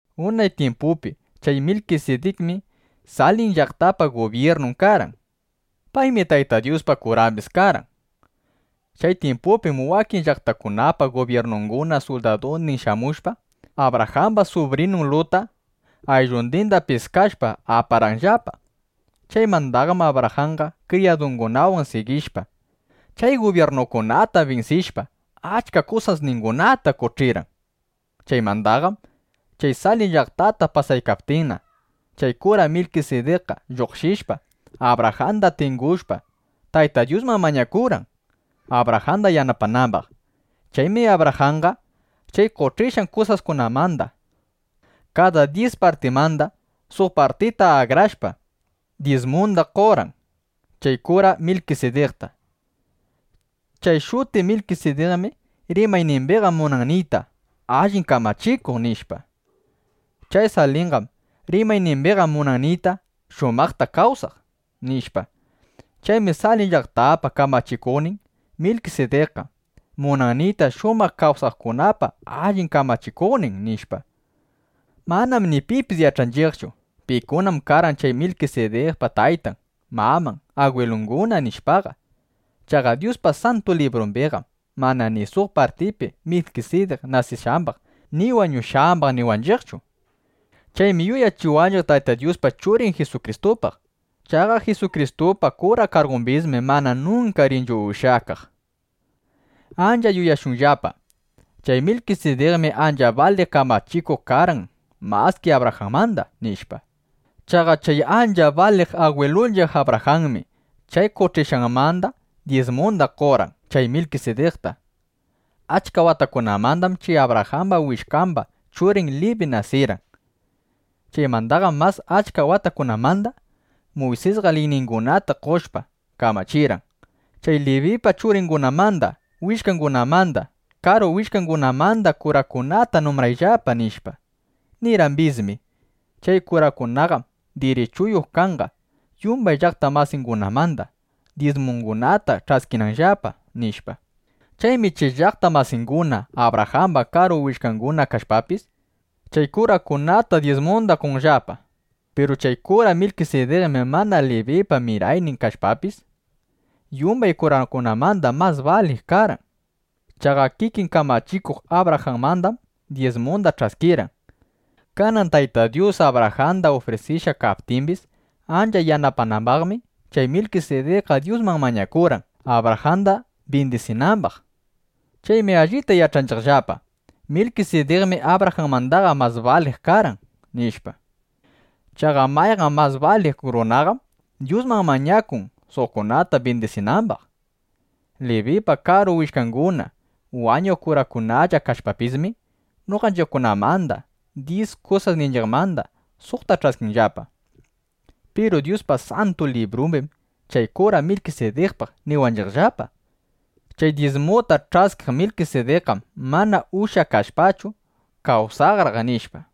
Unay tyimpupi chay Milkisidikmi Salim llaqtapa gubyirnun karqan. Paymi Tayta Dyuspa kurambis karqan. (Chay tyimpupim wakin llaqtakunapa gubyirnunguna suldadundin shamushpa, Abrajamba subrinun Lutta ayllundinda piskashpa, aparqanllapa.) Chaymandaqam Abrajanqa kriyadungunawan sigishpa, chay gubyirnukunata binsishpa, achka kusasningunata qoch'irqan. Chaymandaqam chay Salim llaqtata pasaykaptinna, chay kura Milkisidikqa lluqshishpa, Abrajanda tingushpa, Tayta Dyusman mañakurqan, Abrajanda yanapanambaq. Chaymi Abrajanqa chay qoch'ishqan kusaskunamanda kada dyis partimanda, suq partita akrashpa, dyismunda qorqan chay kura Milkisidikta. Chay shuti Milkisidikmi rimaynimbiqa munan niyta “Allin kamachikuq”, nishpa. Chay Salimqam rimaynimbiqa munan niyta: “Shumaqta kawsaq”, nishpa. Chaymi “Salim llaqtapa kamachikuqnin Milkisidikqa” munan niyta: “Shumaq kawsaqkunapa allin kamachikuqnin”, nishpa. Manam ni pipis yach'anchiqchu: Pikunam karqan chay Milkisidikpa taytan, maman, agwilunguna, nishpaqa. Chaqa Dyuspa Santu Librumbiqam mana ni suq partipi Milkisidik nasishqambaq ni wañushqambaq niwanchiqchu. Chaymi yuyachiwanchiq Tayta Dyuspa Churin Jisukristupaq. Chaqa Jisukristupa kura kargumbismi mana nunka rinchu ushyakaq. Ancha yuyashunllapa: Chay Milkisidikmi ancha baliq kamachikuq karqan maski Abrajanmanda, nishpa. Chaqa chay ancha baliq agwilunchiq Abrajanmi chay qoch'ishqanmanda dyismunda qorqan chay Milkisidikta. (Achka watakunamandam chay Abrajamba willkamba churin Libi nasirqan. Chaymandaqam mas achka watakunamanda) Muysisqa liyningunata qoshpa, kamachirqan: “Chay Libipa churingunamanda, willkangunamanda, karu willkangunamanda kurakunata numbrayllapa”, nishpa. Nirqambismi: “Chay kurakunaqam dirichuyuq kanqa, yumbay llaqta masingunamanda, dyismungunata ch'askinanllapa”, nishpa. Chaymi chay llaqta masinguna Abrajamba karu willkanguna kashpapis, chay kurakunata dyismunda qonllapa. Piru chay kura Milkisidikmi mana Libipa miraynin kashpapis, yumbay kurakunamanda mas baliq karqan. Chaqa kikin kamachikuq Abrajanmandam dyismunda ch'askirqan. Kanan Tayta Dyus Abrajanda ufrisishqa kaptimbis ancha yanapanambaqmi, chay Milkisidikqa Dyusman mañakurqan, Abrajanda bindisinambaq. Chaymi allita yach'anchiqllapa: Milkisidikmi Abrajanmandaqa mas baliq karqan, nishpa. Chaqa mayqan mas baliq runaqam Dyusman mañakun, suqkunata bindisinambaq. Libipa karu willkanguna, wañuq kurakunalla kashpapismi, noqanchiqkunamanda dyis kusasninchiqmanda suqta ch'askinllapa. Piru Dyuspa Santu Librumbim chay kura Milkisidikpaq niwanchiqllapa: “Chay dyismuta ch'askiq Milkisidikqam mana ushyakashpachu, kawsanraq”, nishpa.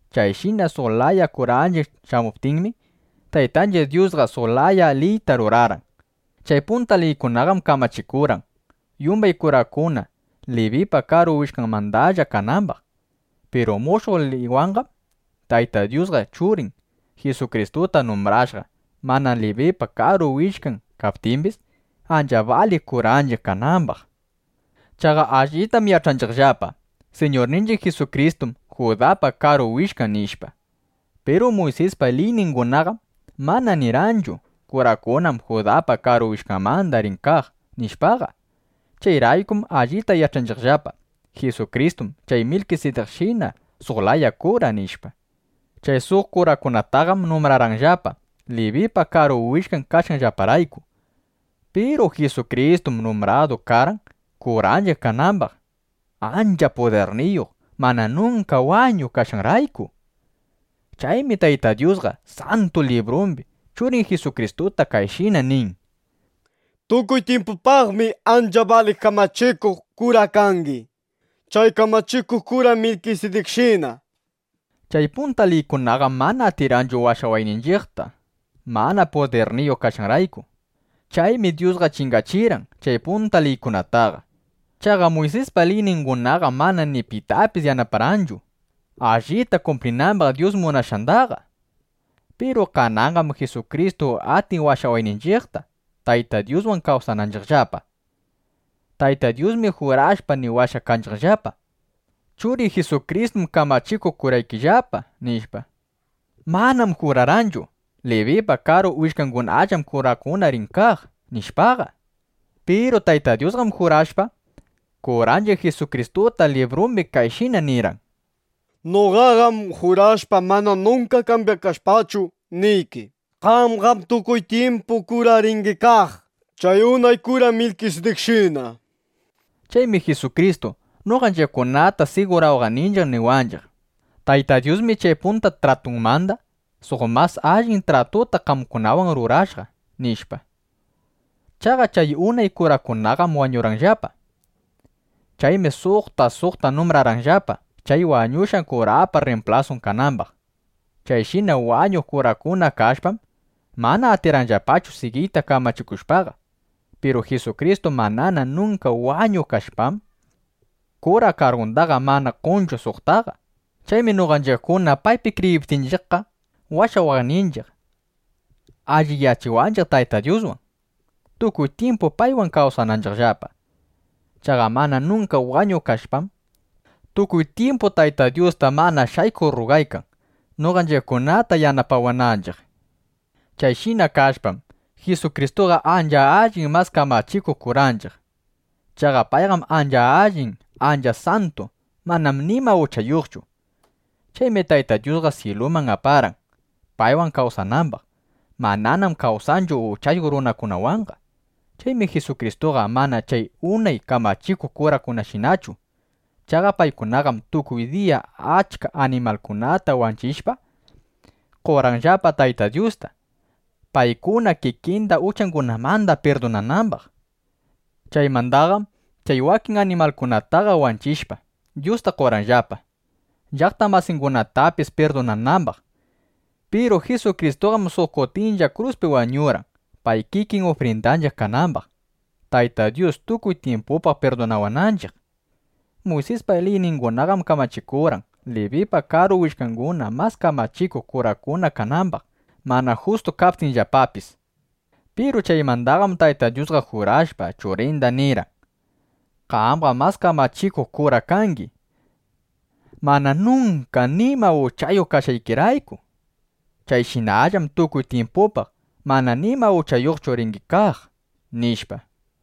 Chayshina suq laya kuranchiq shamuptinmi, Taytanchiq Dyusqa suq laya liyta rurarqan. Chay punta liykunaqam kamachikurqan, yumbay kurakuna Libipa karu willkanmandalla kanambaq. Piru mushuq liywanqam, Tayta Dyusqa Churin Jisukristuta numbrashqa, mana Libipa karu willkan kaptimbis, ancha baliq kuranchiq kanambaq. Chaqa allitam yach'anchiqllapa: Siñurninchiq Jisukristum Judapa karu willkan, nishpa. Piru Muysispa liyningunaqam mana nirqanchu: “Kurakunam Judapa karu willkanmanda rin kaq”, nishpaqa. Chayraykum allita yach'anchiqllapa: Jisukristum chay Milkisidikshina suq laya kura, nishpa. Chay suq kurakunataqam numbrarqanllapa, Libipa karu willkan kashqanllaparayku. Piru Jisukristum numbradu karqan, kuranchiq kanambaq, ancha pudirniyuq mana nunka wañuq kashqanrayku. Chaymi Tayta Dyusqa Santu Librumbi Churin Jisukristuta kayshina nin: Tukuy tyimpupaqmi ancha baliq kamachikuq kura kangi, chay kamachikuq kura Milkisidikshina, nishpa. Chay punta liykunaqam mana atirqanchu washawayninchiqta, mana pudirniyuq kashqanrayku. Chaymi Dyusqa chingachirqan chay punta liykunataqa. Chaqa Muysispa liyningunaqam mana ni pitapis yanaparqanchu, allita kumplinambaq Dyus munashqandaqa. Piru kananqam Jisukristu atin washawayninchiqta, Tayta Dyuswan kawsananchiqllapa. Tayta Dyusmi jurashpa niwashqa kanchiqllapa: “Churiy Jisukristum kamachikuq kuraykillapa”, nishpa. Manam jurarqanchu: “Libipa karu willkangunallam kurakuna rin kaq”, nishpaqa. Piru Tayta Dyusqam jurashpa, kuranchiq Jisukristuta librumbi kayshina nirqan: Noqaqam jurashpa mana nunka kambyakashpachu, niyki: “Qamqam tukuy tyimpu kura ringi kaq, chay unay kura Milkisidikshina”, nishpa. Chaymi Jisukristu noqanchiqkunata sigurawaqninchiq niwanchiq: “Tayta Dyusmi chay punta tratunmanda suq mas allin tratuta qamkunawan rurashqa”, nishpa. Chaqa chay unay kurakunaqam wañurqanllapa. Chaymi suqta suqta numbrarqanllapa, chay wañushqa kurapa rrimplasun kanambaq. Chayshina wañuq kurakuna kashpam, mana atirqanllapachu sigiyta kamachikushpaqa. Piru Jisukristu manana nunka wañuq kashpam, kura kargundaqa mana qonchu suqtaqa. Chaymi noqanchiqkuna paypi kriyiptinchiqqa, washawaqninchiq, alliyachiwanchiq Taytan Dyuswan, tukuy tyimpu paywan kawsananchiqllapa. Chaqa mana nunka wañuq kashpam, tukuy tyimpu Tayta Dyusta mana shaykuq rrugaykan, noqanchiqkunata yanapawananchiq. Chayshina kashpam, Jisukristuqa ancha allin mas kamachikuq kuranchiq. Chaqa payqam ancha allin, ancha santu. Manam nima uchayuqchu. Chaymi Tayta Dyusqa syiluman aparqan, paywan kawsanambaq. Mananam kawsanchu uchayuq runakunawanqa. Chaymi Jisukristuqa mana chay unay kamachikuq kurakunashinachu. Chaqa paykunaqam tukuy diya achka animalkunata wanchishpa, qorqanllapa Tayta Dyusta, paykuna kikinda uchangunamanda pirdunanambaq. Chaymandaqam chay wakin animalkunataqa wanchishpa, Dyusta qorqanllapa, llaqta masingunatapis pirdunanambaq. Piru Jisukristuqam suq kutindalla kruspi wañurqan, pay kikin ufrindanchiq kanambaq, Tayta Dyus tukuy tyimpupaq pirdunawananchiq. Muysispa liyningunaqam kamachikurqan, Libipa karu willkanguna mas kamachikuq kurakuna kanambaq, mana justu kaptinllapapis. Piru chaymandaqam Tayta Dyusqa jurashpa, Churinda nirqan: “Qamqam mas kamachikuq kura kangi, mana nunka nima uchayuq kashqaykirayku. Chayshinallam tukuy tyimpupaq mana nima uchayuqchu ringi kaq”, nishpa.